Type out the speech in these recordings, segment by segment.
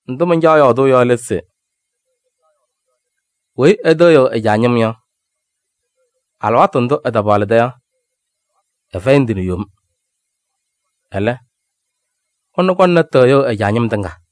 Ndʋ mancaɣ yɔɔdʋʋ yɔ lɛ se: weyi ɛtɩɣyɩɣ ɛ-caa ñɩm yɔ, alɩwaatʋ ndʋ ɛtapaɣlɩda yɔ, ɛfɛyɩ ndɩ nɛ yom. Ɛlɛ, ɛnʋ kɔŋna tɩɣyʋʋ ɛ-caa ñɩm tɩŋa.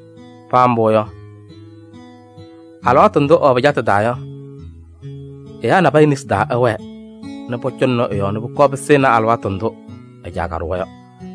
Paa mbʋ yɔ, alɩwaatʋ ndʋ ɛwɛ pɩcatʋ taa yɔ, ɛyaa nabɛyɛ nesi taa ɛwɛɛ nɛ pɔcɔŋnɩ ɛ-yɔɔ nɛ pʋkɔɔ pɩsɩnɩ alɩwaatʋ ndʋ ɛ-caa kaɖʋwa yɔ.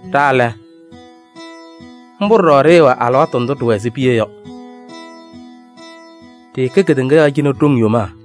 Ɖa lɛ, mbʋ ɖɔɖɔ ɖɩɩwɛ alɩwaatʋ ndʋ ɖɩɩwɛ ɛzɩ piya yɔ. Ɖɩɩkɛ kedeŋa yɔɔ cɩnɛ ɖoŋ yomaa.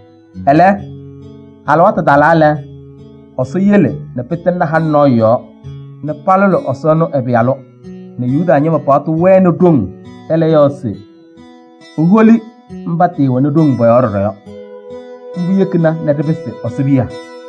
Ɛlɛ, alɩwaatʋ talaa lɛ, Ɛsɔ yele nɛ pɩtɩŋnɩ halʋ nɔɔyʋ yɔɔ nɛ palʋlɩ Ɛsɔ ɛnʋ ɛ-Pɩyalʋ nɛ Yuda ñɩma paɣtʋ wɛnɩ ɖoŋ ɛlɛ yɔɔ se eholi mba tɩɩwɛnɩ ɖoŋ pɔ-yɔɔ ɖɔɖɔ yɔ. Mbʋ yekina nɛ ɖɩpɩsɩ Ɛsɔ piya.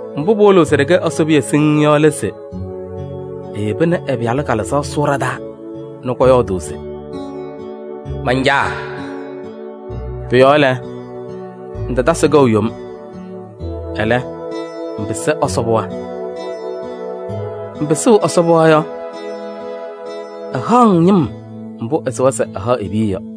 Mbʋ pɩwɩlɩɣ se ɖɩkɛ e-piya siŋŋ yɔ lɛ se eyeba nɛ ɛ-Pɩyalʋ Kalɩzaɣ sʋʋ ɖa-taa nɛ kɔyɔɔdʋʋ se: “Man-Caa!” Pʋ-yɔɔ lɛ, ŋtatasɩ kɛʋ yom, ɛlɛ, ŋpɩsɩ Ɛsɔ pɩɣa. Ŋpɩsɩ ɛ-pɩɣa yɔ, ɛhaɣ-ŋ ñɩm mbʋ ɛsɩwa se ɛhaɣ e-piya yɔ.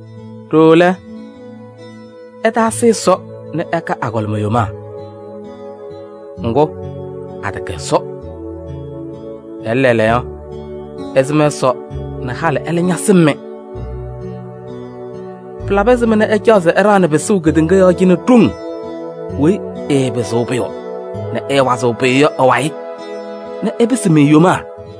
Ɖooo lɛ, ɩtaasɩ Ɛsɔ nɛ ɩkɛ agɔlɩma yomaa. Ŋgʋ, atɛkɛ Ɛsɔ. Ɛlɛ, lɛɛlɛɛyɔ, ɩsɩm Ɛsɔ nɛ halɩ ɛlɛ ñasɩm-mɩ. Pɩlabɩ ɛzɩma nɛ ɩcaɣ se ɩɖaɣnɩ pɩsʋʋ kedeŋa yɔɔ cɩnɛ ɖoŋ weyi ɩɩpɩzɩɣ pʋyʋ nɛ ɩɩwazɩɣ pʋyʋ yɔ ɩ-wayɩ se ɩpɩsɩ-mɩ yomaa?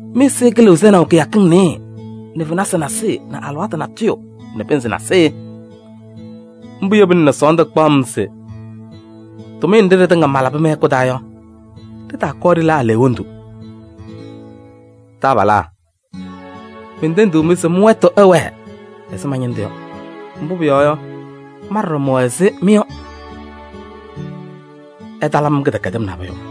Mɩ-ɛzɩyɛ kɩlɩɣ sɛnaʋ kɩyakɩŋ nɩyɩɩ nɛ fenasɩ nasɩyɩ nɛ alɩwaatʋ natʋyʋ nɛ pɩnzɩ nasɩyɩ! Mbʋ yebina nɛ sɔɔndʋ kpaɣ-m se tʋmɩyɛ nɖɩ ɖɩtɩŋa malabɩ mɩ-hɛkʋ taa yɔ, ɖɩtaakɔɔ ɖɩla aleɣwondu. Taabalaa! Mentendiɣ-mɩ se mɩ-wɛtʋ ɛwɛɛ ɛzɩ ma-ñɩndʋ yɔ, mbʋ pʋyɔɔ yɔ, ma ɖɔɖɔ mɛwɛ ɛzɩ mɩ yɔ. Ɩtalabɩ-m kɩdɛkɛdɩm nabʋyʋ.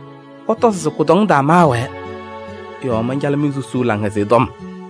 Ɩtɔzɩ se kʋdɔŋ taa maawɛɛ yɔɔ mancalɩ-mɩ susuu Laŋhɛzɩyɛ Tɔm.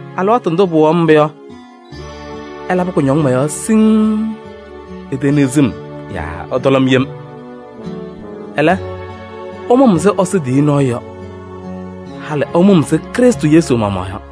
Alɩwaatʋ ndʋ pɩwɩɣaɣ-m mbʋ yɔ, ɩlabɩ kʋñɔŋ mɔ-yɔɔ siŋŋ, iteniɣzi-m yaa ɩtɔlɔ-m yem. Ɛlɛ, ɩmʋ-m ɛzɩ Ɛsɔ tiyiyu nɔɔyʋ yɔ, halɩ ɩmʋ-m ɛzɩ Krɩstʋ Yesu maɣmaɣ yɔ.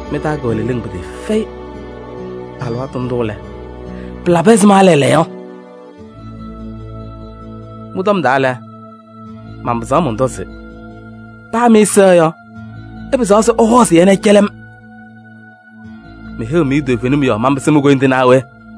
Mɩ-taa kɛwɛ leleŋ pɩtɩɩfɛyɩ alɩwaatʋ ndʋ lɛ, pɩla ɛzɩma lɛɛlɛɛyɔ? Mɩ-tɔm taa lɛ, manpɩzaɣ mɔntɔ se: paa mɩ-ɛza yɔ, ɩpɩzaɣ se ɩhɔɔzɩ-yɛ nɛ ɩcɛlɩ-m. Meheyiɣ-mɩ toovenim yɔɔ manpɩsɩ mi-koyindu naa we?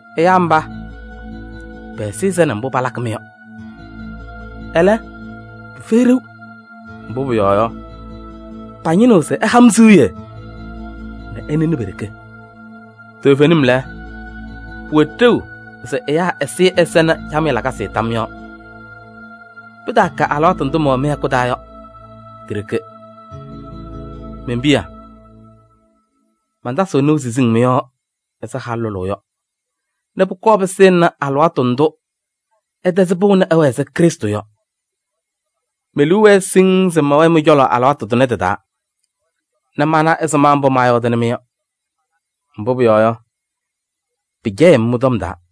Ɛyaa mba, pɛ-ɛzɩyɛ sɛnɩ mbʋ palakɩ-mɩ yɔ, ɛlɛ, pɩfɛyɩ ɖeu. Mbʋ pʋyɔɔ yɔ, pañɩnɩɣ se ɩha-m siɣye nɛ ɩnɩnɩ pe-ɖeke. Toovenim lɛ, pɩwɛ ɖeu se ɛyaa ɛzɩyɛ ɛsɛnɩ camɩyɛ lakasɩ tam yɔɔ. Pɩtaakɛ alɩwaatʋ ndʋ mɛwɛ mɩ-hɛkʋ taa yɔ, ti-ɖeke. Men-piya! Mantasɩɣ nɩʋ siziŋ mɩ-yɔɔ ɛzɩ halʋ lʋlʋʋ yɔ nɛ pʋkɔɔ pɩsɩnɩ alɩwaatʋ ndʋ ɩtɛzɩ pɩʋ nɛ ɩwɛɛ ɛzɩ Krɩstʋ yɔ. Me-liu wɛɛ siŋŋ se mɛwɛɛ mɩ-cɔlɔ alɩwaatʋ tʋnɛ tɩ-taa nɛ mana ɛzɩma mbʋ maayɔɔdɩnɩ-mɩ yɔ. Mbʋ pʋyɔɔ yɔ, pɩcɛyɩɣ-m mɩ-tɔm taa!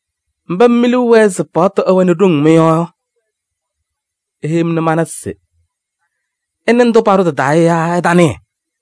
Mba mɩ mi-liu wɛɛ se paɣtʋ ɛwɛnɩ ɖoŋ mɩ-yɔɔ yɔ, iheyi-m nɛ mana se ɩnɩ ndʋ paɖʋ tɩ-taa yɔ yaa ɩtanɩɩ?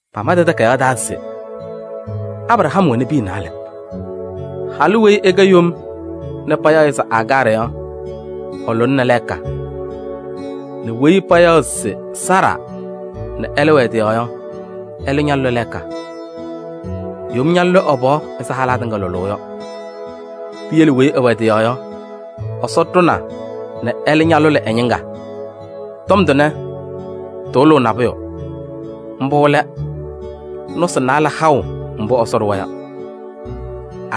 Pama tɩ-takayaɣ taa se Abraham wɛnɩ piya naalɛ: halʋ weyi ɛkɛ yom nɛ payaɣ-ɩ se Agaarɩ yɔ, ɛlʋlɩnɩ lɛɛka nɛ weyi payaɣ se Saara nɛ ɛlɛ wɛ ɛ-tɩ yɔɔ yɔ, ɛlɛ ñalʋlɩ lɛɛka. Yom ñaalʋlɩ ɛ-pɩɣa ɛzɩ halaa tɩŋa lʋlʋʋ yɔ. Piyele weyi ɛwɛ ɛ-tɩ yɔɔ yɔ, Ɛsɔ ɖʋna nɛ ɛlɛ ñalʋlɩ ɛ-ñɩŋga. Tɔm tʋnɛ tɩwɩlɩɣ nabʋyʋ, mbʋ lɛ: nɔsɩ naalɛ haʋ mbʋ Ɛsɔ ɖʋwa yɔ.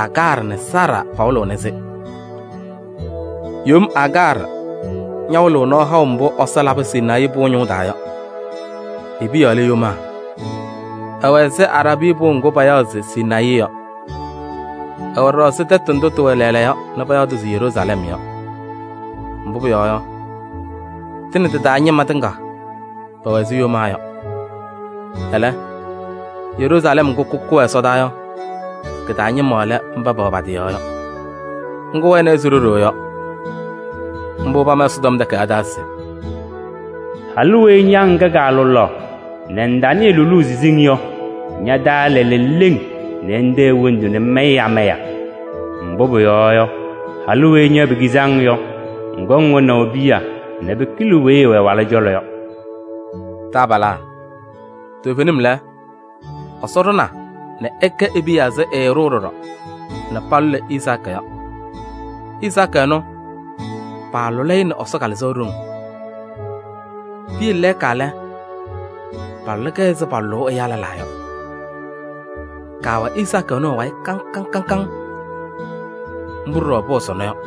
Agaarɩ nɛ Saara pawɩlɩɣnɩ-sɩ. Yom Agaarɩ ñawɩlɩɣ nɔɔ haʋ mbʋ Ɛsɔ labɩ Sinayii pʋʋ ñʋʋ taa yɔ, e-piya lɛ yomaa. Ɛwɛ ɛzɩ Araabii pʋʋ ŋgʋ payaɣ se Sinayii yɔ. Ɛwɛ ɖɔɖɔ ɛzɩ tɛtʋ ndʋ tɩwɛ lɛɛlɛɛyɔ nɛ payaɣ-tʋ se Yeruusalɛm yɔ. Mbʋ pʋyɔɔ yɔ, tɩ nɛ tɩ-taa ñɩma tɩŋa pɛwɛ ɛzɩ yomaa yɔ. Ɛlɛ, Yeruusalɛm ŋgʋ kʋkʋ wɛ ɛsɔdaa yɔ kɩ-taa ñɩma lɛ mba pɛwɛ pa-tɩ yɔɔ yɔ, ŋgʋ wɛna ɛzɩ ɖo-ɖoo yɔ. Mbʋ pama Ɛsɔtɔm Takayaɣ taa se: “Halʋ weyi ña ŋkɛ kaalʋlaɣ nɛ ŋtanɩɩ lʋlʋʋ siziŋ yɔ, ña-taa ɛla leleŋ nɛ ŋtee hendu nɛ ŋmayɩ amaya! Mbʋ pʋyɔɔ yɔ, halʋ weyi ña pekizi-ŋ yɔ, ŋkɔŋ wɛnaʋ piya nɛ pɩkɩlɩ weyi ɛwɛ ɛ-walʋ cɔlɔ yɔ.” Taabalaa! Toovenim lɛ, Ɛsɔ ɖʋna nɛ ɩkɛ e-piya ɛzɩ ɛɖʋʋ ɖɔɖɔ nɛ palʋlɩ Izaakɩ yɔ. Izaakɩ ɛnʋ, paalʋlɩ-ɩ nɛ Ɛsɔ Kalɩzaɣ ɖoŋ. Piyele lɛɛka lɛ, palʋlɩ-kɛ ɛzɩ palʋlʋʋ ɛyaa lɛlaa yɔ. Kaawɛ Izaakɩ ɛnʋ ɛ-wayɩ kaŋ kaŋ. Mbʋ ɖɔɖɔ pʋwɛ sɔnɔ yɔ.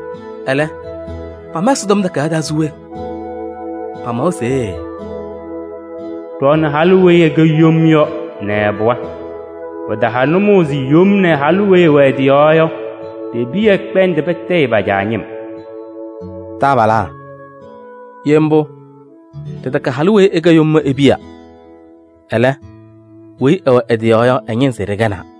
Ɛlɛ, pama Ɛsɔtɔm Takayaɣ taa se we? Pamawa se: “Ɖɔɔnɩ halʋ weyi ɛkɛ yom yɔ nɛ ɛ-pɩɣa. Pɩtaha nʋmɔʋ se yom nɛ halʋ weyi ɛwɛ ɛ-tɩ yɔɔ yɔ pe-piya ɛkpɛndɩ patɩɣyɩ pa-caa ñɩm.” Taabalaa! Ye mbʋ, ɖɩtɛkɛnɩ halʋ weyi ɛkɛ yom yɔ e-piya, ɛlɛ, weyi ɛwɛ ɛ-tɩ yɔɔ yɔ, ɛ-ñɩnzɩ ɖɩkɛnaa.